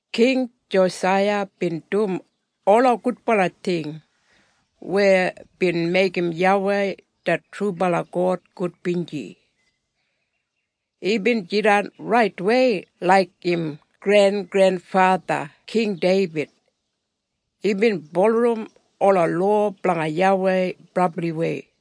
King Josaiya bin dum ola gudbala ting weya bin meigim YAWEI det trubala God gudbinji. Imbin jidan raitwei laik im grengrenfatha King Deibid. Imbin bulurrum ola lowa blanga YAWEI brabliwei.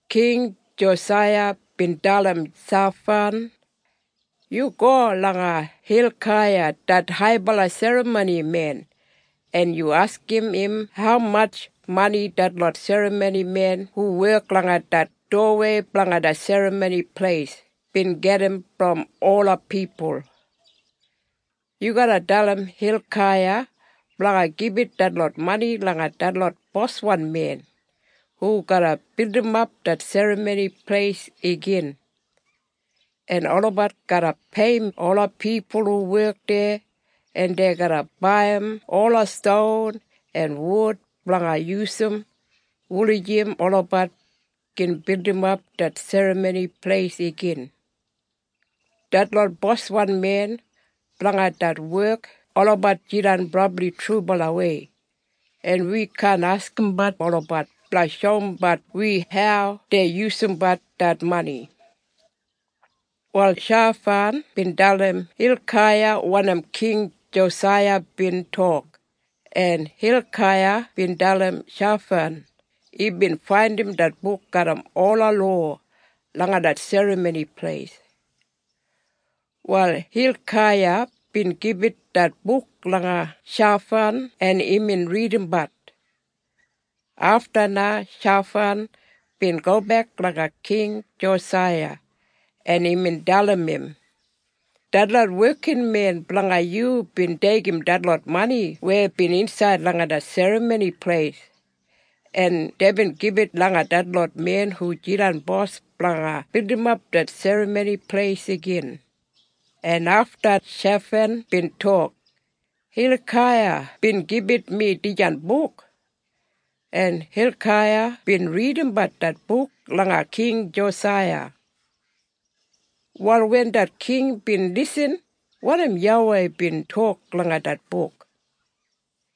King Josaiya bin dalim Shafan, “Yu go langa Hilkaiya det haibala serramonimen en yu askim im haumatj mani detlot serramonimen hu wek langa det dowawei blanga det Serramoni Pleis bin gedim brom ola pipul. Yu garra dalim Hilkaiya blanga gibit detlot mani langa detlot boswan men hu garra bildimap det Serramoni Pleis igin. En olabat garra peiyim ola pipul hu wek deya, en dei garra baiyim ola ston en wud blanga yusum wulijim olabat gin bildimap det Serramoni Pleis igin. Detlot boswan men blanga det wek olabat jidan brabli trubalawei, en wi kaan askimbat olabat blanga shoumbat wi hau dei yusumbat det mani.” Wal Shafan bin dalim Hilkaiya wanim King Josaiya bin tok, en Hilkaiya bin dalim Shafan imbin faindim det buk garram ola lowa langa det Serramoni Pleis. Wal Hilkiaya bin gibit det buk langa Shafan en imbin ridimbat. Afta na Shafan bin gobek langa King Josaiya en imbin dalim im, “Detlot wekinmen blanga yu bin deigim detlot mani weya bin insaid langa det Serramoni Pleis en deibin gibit langa detlot men hu jidan bos blanga bildimap det Serramoni Pleis igin.” En afta Shafan bin tok, “Hilkaiya bin gibit mi dijan buk.” En Hilkaiya bin ridimat det buk langa King Josaiya. Wal wen det king bin lisin wanim YAWEI bin tok langa det buk,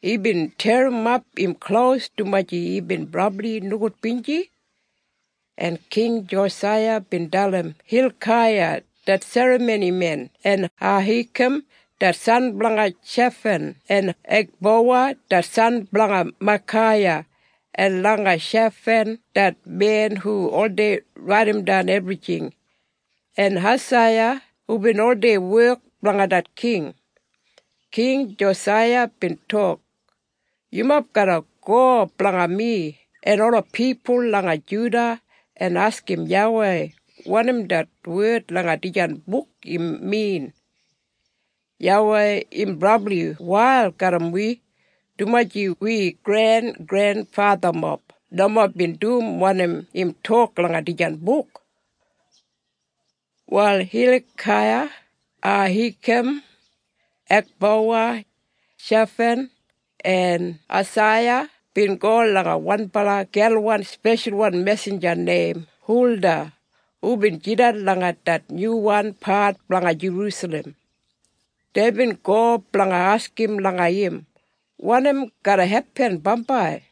imbin terrimap im klos dumaji imbin brabli nogudbinji. En King Josaiya bin dalim Hilkaiya det serramonimen en Ahikam det san blanga Shafan en Ekbowa det san blanga Maikaiya en langa Shafan det men hu oldei raidimdan ebrijing, en Esaiya hubin oldei wek blanga det king. King Josaiya bin tok, “Yumob garra go blanga mi en ola pipul langa Juda en askim YAWEI wanim det wed langa dijan buk im min. YAWEI im brabli wail garram wi, dumaji wi grengrenfathamob nomo bin dum wanim im tok langa dijan buk.” Wal Hilkaiya, Ahikam, Ekbowa, Shafan en Esaiya bin go langa wanbala gelwan speshalwan mesinja neim Hulda hubin jidan langa det nyuwan pat blanga Jerusalem. Deibin go blanga askim langa im wanim garra hepin bambai.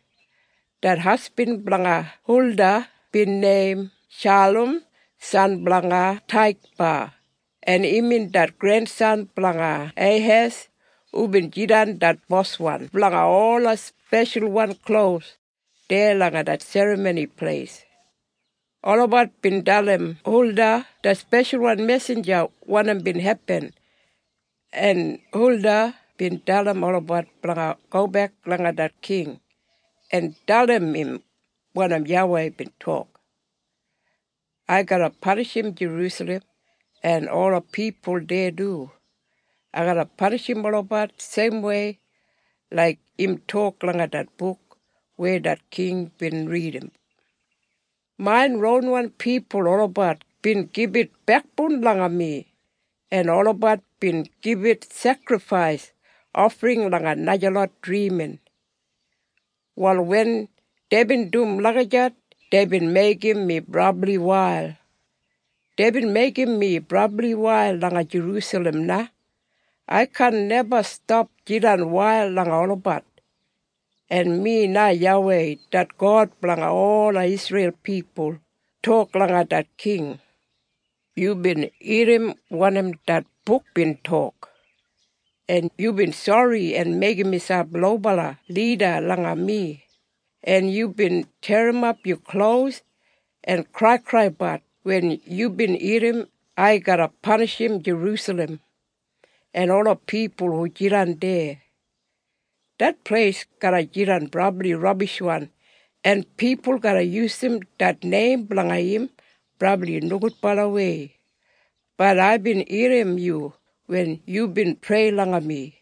Det hasbin blanga Hulda bin neim Shalum san blanga Taikba en imbin det grensan blanga Hehas hubin jidan det boswan blanga ola speshalwan klos deya langa det Serramoni Pleis. Olabat bin dalim Hulda det speshalwan mesinja wanim bin hepin. En Hulda bin dalim olabat blanga gobek langa det king en dalim im wanim YAWEI bin tok, “Ai garra panishim Jerusalem en ola pipul deya du. Ai garra panishim olabat seimwei laik im tok langa det buk weya det king bin ridim. Main ronwan pipul olabat bin gibit bekboun langa mi en olabat bin gibit sekrifais ofring langa najalot drimin. Wal wen deibin dum lagijat deibin meigim mi brabli wail. Deibin meigim mi brabli wail langa Jerusalem na. Ai kaan neba stap jidan wail langa olabat. En mi na YAWEI det God blanga ola Isreil pipul tok langa det king, ‘Yubin irrim wanim det buk bin tok, en yubin sori en meigim miselp lobala lida langa mi en yubin terrimap yu klos en kraikraibat wen yubin irrim ai garra panishim Jerusalem en ola pipul hu jidan deya. Det pleis garra jidan brabli rabishwan en pipul garra yusum det neim blanga im brabli nogudbalawei, bat aibin irrim yu wen yubin prei langa mi,